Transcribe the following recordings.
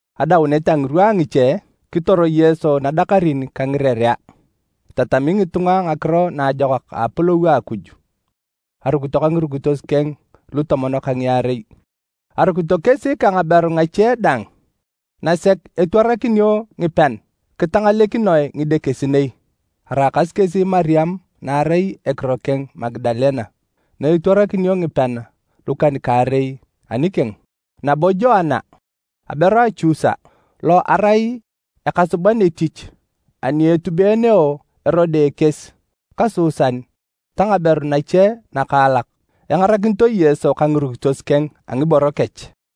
Adaunet a ngirwa a ngiche, kitor Yesu nadakarin ka ngirerea, itatami ngitunga Ngakiro Naajokak a Apolou a Akuj. Arukito ka ngirukitos keng lutomon ka ngiarei. Arukito kesi ka ngaberu ngache dang nasek etwarakinio ngipean kitangalekinoe ngidekesinei: araakasi kesi Mariam na arai ekiro keng Magadalene na etwarakinio ngipean lukan-kaarei anikeng, nabo Joana, aberu a Chusa, lo arai ekasuban etich ani etubeeneo Erode ekies ka Susan ta ngaberu nache nakaalak na engarakinito Yesu ka ngirukitos keng a ngiboro kech.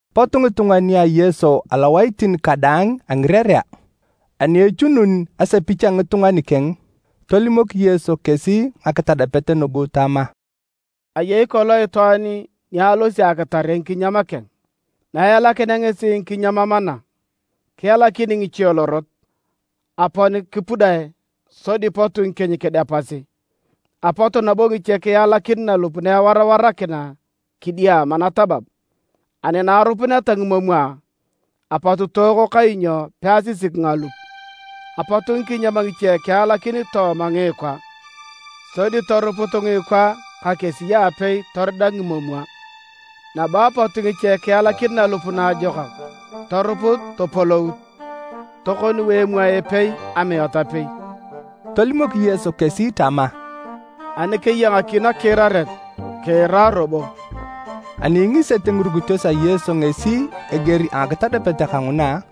Pot ngitunga nia Yesu alowaitin kadaang a ngirerea, ani echunun asepich a ngitunga nikeng, tolimok Yesu kesi ngakitadapet nugu tama: “Ayei kolong itwaan ni alosi akitare ngikinyam keng. Naelakinea ngesi ngikinyam mana, kialakin ngiche lorot, apon kipudae, sodi pot ngikieny kidepasi. Apot nabo ngiche kialakin nalup na ewarawarakina kidiama natabab, ani na arupuneta ngimomwa, apot tooko kainyo peasisik ngalup. Apot ngikinyam ngiche kialakin tooma ngiikwa, sodi toruput ngiikwa ka kesi aapei torida ngimomwa. Nabo apot ngiche kialakin nalup naajokak toruput topolout, tokoniu emwae epei amiat apei.” Tolimok Yesu kesi tama, “Ani keya ngaki nakiiraret, kiira robo!” Ani ingisete ngirukitos a Yesu ngesi eger a ngakitadapet kanguna,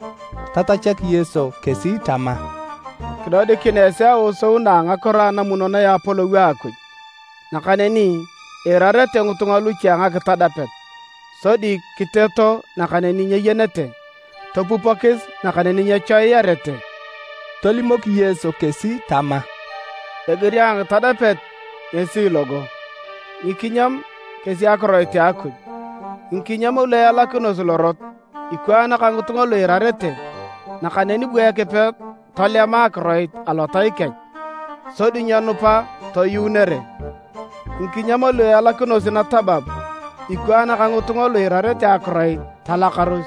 tatachak Yesu kesi tama, “Kidodikin esi aosou na a ngakiro anamunonoe a Apolou a Akuj, nakaneni iirarete ngitunga luche a ngakitadapet. Sodi kiteeto nakaneni nyeyenete, topupokis nakaneni nyechoiyarete.” Tolimok Yesu kesi tama, “Eger a ngakitadapet ngesi logo: ngikinyam kesi akiroit a Akuj. Ngikinyam lu ealakinosi lorot ikwaan ka ngitunga lu iirarete, nakaneni bu Ekipe tolema akiroit alotai kech, sodi nyenupa toyuunere. Ngikinyam lu ealakinosi natabab ikwaan ka ngitunga lu iirarete akiroit talakaros,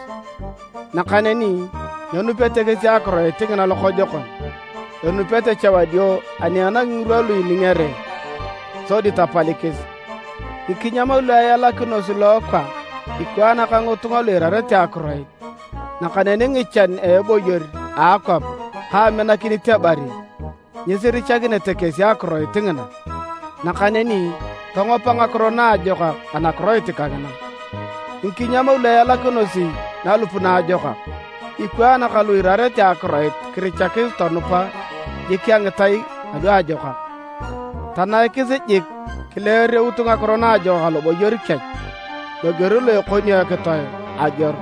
nakaneni nyenupete kesi akiroit ngina lokojokon, enupete cha wadio ani enangi ngirwa lu iningere, sodi tapalikis. Ngikinyam lu ealakinosi lookwa ikwaan ka ngitunga lu iirarete akiroit, nakaneni ngichan a eboyor a akwap ka aminakinit ebari, nyisirichakinete kesi akiroit ngina, nakaneni tongopa ngakiro naajokak anakiroit kangina. Ngikinyam lu ealakinosi nalup naajokak ikwaan ka lu iirarete akiroit kirichakis tonupa jik a ngitai aluajokak, tanaikis jik kileereut ngakiro naajokak aloboyor kech, loger lo ekonio ekitoe ageor.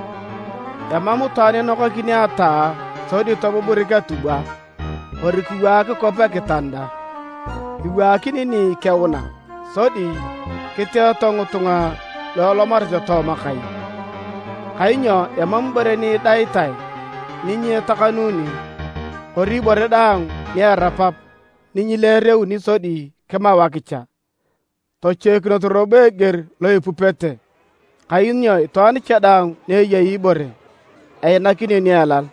“Emam itwaan inokakini ataa sodi tobuburik atubwa kori kiwaak kwap ekitanda. Iwaakini ni ikeuna, sodi kiteeto ngitunga na elomareta tooma kai. “Kainyo emam ibore ni idaitae ni nyetakanuni, kori ibore daang ni erapap ni nyileereuni sodi kimau akicha. “Tochoikinos robo eger lo ipupete, kainyo itwaan cha daang ni eyei ibore, einakinio ni elal,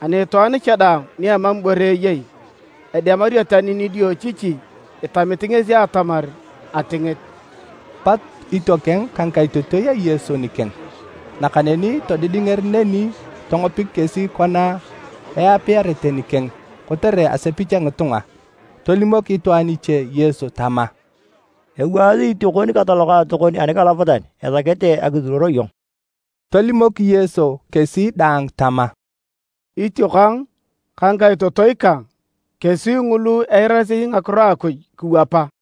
ani itwaan cha daang ni emam ibore eyei, edemario tani nidiochichi itamit ngesi atamar atingit.” Pot itiokeng ka ngikaitotoi a Yesu nikeng, nakaneni todidinger neni tongopik kesi kona eapiarete nikeng kotere asepich a ngitunga. Tolimok itwaan iche Yesu tama, “Ewaasi itiokon ka talokaatokon anikalapatan esakete akisuruor iyong.” Tolimok Yesu kesi daang tama, “Itiokang ka ngikaitotoi kang kesi ngulu eirasi ngakiro a Akuj kiwapa.”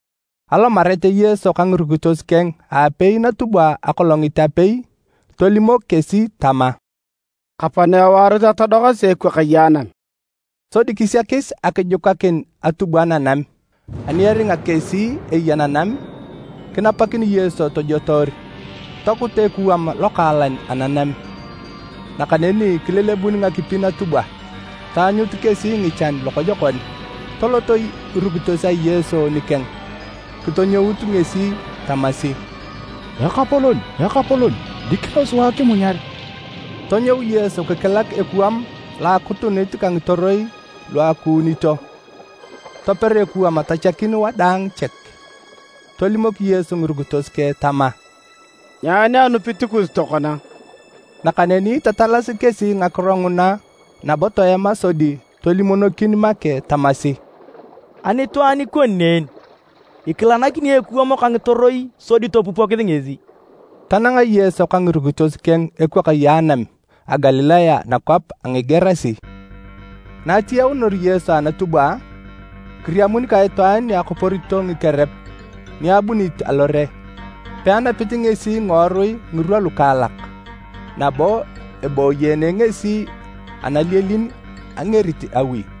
Alomarete Yesu ka ngirukitos keng aapei natubwa akolongit apei, tolimok kesi tama, “Kapana ewaaros atodokasi ekwakaye anam.” Sodi kisiakis akijukakin atubwa nanam. Ani eringa kesi eya nanam, kinapakin Yesu tojotoor. Tokut ekuwam lokaalan ananam, nakaneni kilelebun ngakipi natubwa. Taanyut kesi ngichan lokojokon. Toloto ngirukitos a Yesu nikeng kitokienyut ngesi tamasi, “Ekapolon! Ekapolon! Dikino sua kimunyar.” Tonyou Yesu kikilak ekuwam lo akutunit ka ngitoroi lu akuunito. Toper ekuwam tachakin wadaang chek. Tolimok Yesu ngirukitos keng tama, “Nyaani anupit kus tokona?” Nakaneni tatalasi kesi ngakiro nguna nabo toema sodi tolimonokin make tamasi, “Ani itwaan ikoni ne en? Ikilanakini ekuwam ka ngitoroi sodi topupokis ngesi!” Tananga Yesu ka ngirukitos keng ekwakaye anam a Galilaya nakwap a Ngigerasi. Na atiyaunor Yesu anatubwa, kiriamun ka itwaan ni akoporito ngikerep ni abunit alore. Peanapit ngesi ngiworui ngirwa lukaalak nabo eboyeene ngesi analielin angerit awi.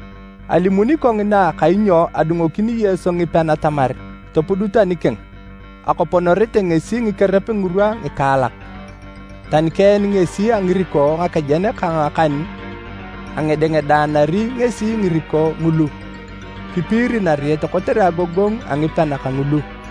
Alimuni kongina kainyo adungokini Yesu ngipean atamar topudut anikeng. Akoponorete ngesi ngikerep ngirwa ngikaalak, tani keen ngesi a ngiriko ngakejen ka ngakan, angedengedaanari ngesi ngiriko ngulu, kipiiri nariet kotere agogongu a ngikerep kangulu.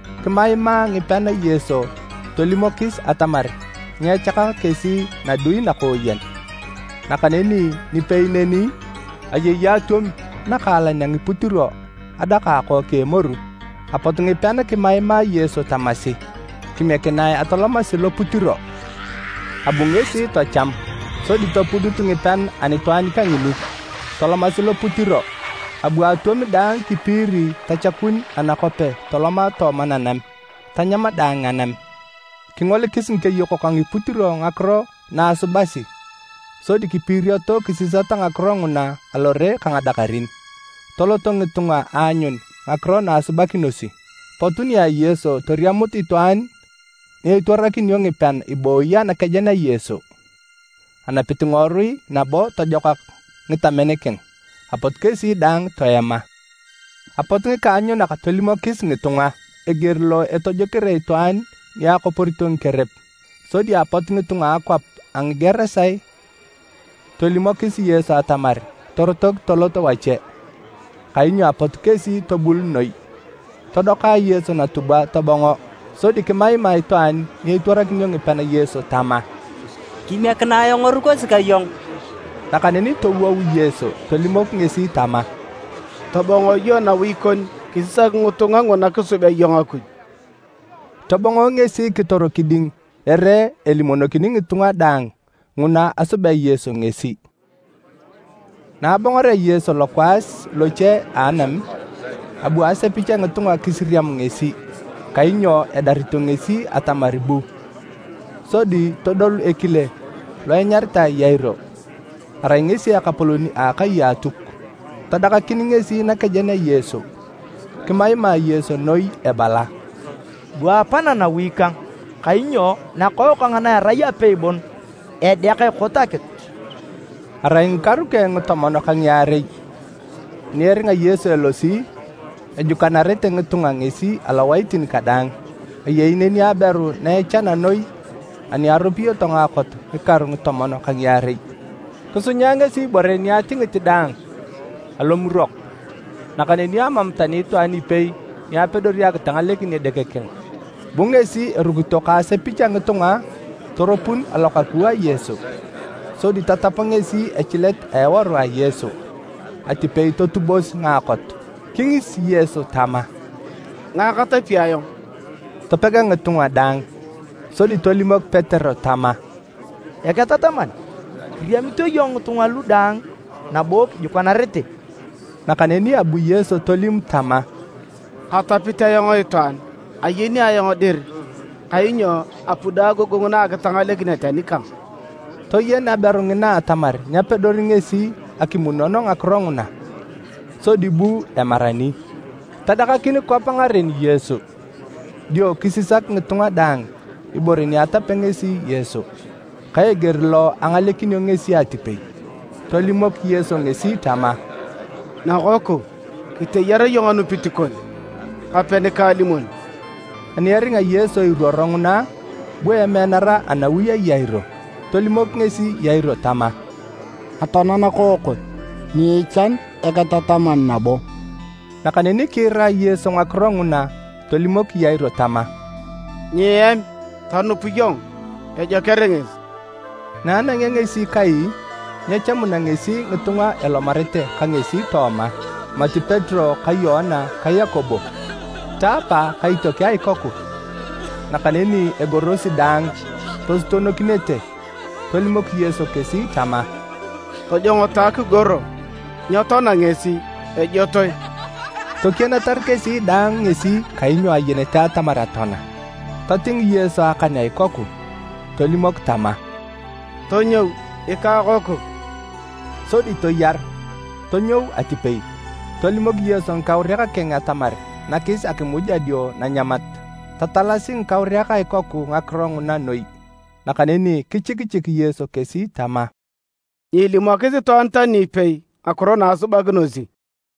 Kimaimaa ngipean Yesu tolimokis atamar nyechakak kesi nadui nakooyen. Nakaneni nipei neni, ayei atwom nakaalan a ngiputiro adaka akook a emoru. Apot ngipean kimaimaa Yesu tamasi, “Kimiekinae atolomasi loputiro.” Abu ngesi tacham. Sodi topudut ngipean anitwaan kangini, tolomasi loputiro, abu atwom daang kipiiri tachakun anakope toloma tooma nanam, tanyam daang anam. Kingolikis ngikeyokok a ngiputiro ngakiro na asubasi sodi kipiirioto kisisata ngakiro nguna alore ka ngadakarin. Toloto ngitunga aanyun ngakiro na asubakinosi. Pot nia Yesu toriamut itwaan ni etwarakinio ngipean ibooyi anakejen a Yesu, enapit ngiworui nabo tojokak ngitamen keng. Apot kesi daang toema. Apot ngikaanyunak tolimokis ngitunga eger lo etojokere itwaan ni akoporito ngikerep. Sodi apot ngitunga a akwap a Ngigerasi tolimokis Yesu atamar torotok tolot wache, kainyo apot kesi tobul noi. Todoka Yesu natubwa tobongo. Sodi kimaima itwaan ni etwarakinio ngipean Yesu tama, “Kimiekinae ayong erukosi ka iyong!” Nakaneni towou Yesu tolimok ngesi tama, “Tobong iyong nawi kon kisisak ngitunga nguna kisubea iyong Akuj.” Tobongo ngesi kitor kiding ere elimonokini ngitunga daang nguna asubea Yesu ngesi. Na abongorea Yesu lokwaas loche a anam, abu asepich a ngitunga kisiriam ngesi, kainyo edarito ngesi atamar bu. Sodi todolu ekile lo enyaritae Yairo, arai ngesi ekapolon a akai a Atuk. Tadakakin ngesi nakejen a Yesu, kimaima Yesu noi ebala, “Bua apana nawi kang. Kainyo nakookang na erai apei bon edeak ekot akitu.” Arai ngikaru keng ngitomon ka ngiarei. Ani eringa Yesu elosi, ejukanarete ngitunga ngesi alowaitin kadaang. Ayei neni aberu na echana noi ani aropiyoto ngaakot ngikaru ngitomon ka ngiarei. Kisunya ngesi ngiboro keng daang alomurok, nakaneni amam tani itwaan ipei ni apedori akitangalekin edeke keng. Bu ngesi erukito ka asepich a ngitunga toropun alokaku a Yesu, sodi tatap ngesi echilet a eworu a Yesu, atipei totubos ngaakot. Kingis Yesu tama, “Ngae katapi ayong?” Topega ngitunga daang, sodi tolimok Petero tama, “Eketataman, kiriamito iyong ngitunga lu daang nabo kijukanarete.” Nakaneni abu Yesu tolim tama, “Katapit ayong itwaan, ayeni ayong dir kainyo apudo agogongu na akitangalekinet anikang.” Toyen aberu ngina atamar nyapedori ngesi akimunon ngakiro nguna, sodi bu emarani, tadakakin kwap ngaren Yesu. Dio kisisak ngitunga daang ibore ni atapea ngesi Yesu, ka eger lo angalekinio ngesi atipei. Tolimok Yesu ngesi tama, “Nakoku, kiteyar iyong anupit kon. Kape nikaalimon.” Ani eringa Yesu iruoro nguna, bu emeanara anawi a Yairo. Tolimok ngesi Yairo tama, “Atoana nakookon, nyiichan Eketataman nabo.” Nakaneni kiira Yesu ngakiro nguna tolimok Yairo tama, “Nyiem, tonup iyong, ejoker ngesi.” Na anangea ngesi kai, nyechamuna ngesi ngitunga elomarete ka ngesi tooma, mati Petero ka Yoana ta Yakobo, ta apa ka itiokeng a ikoku. Nakaneni egorosi daang, tosutonokinete. Tolimok Yesu kesi tama, “Tojongoto akigoro, nyetoana ngesi, ejotoe!” Tokianatar kesi daang ngesi kainyo ayenete atamar atoana. Toting Yesu akan a ikoku, tolimok tama, “Tonyou ikakoku!” Sodi toyaru, tonyou atipei, tolimok Yesu ngikauriak keng atamar nakis akimuj adio nanyamat. Tatalasi ngikauriak a ikoku ngakiro nguna noi, nakaneni kichikichik Yesu kesi tama, “Nyiilimokis itwaan tani ipei ngakiro na asubakinosi.”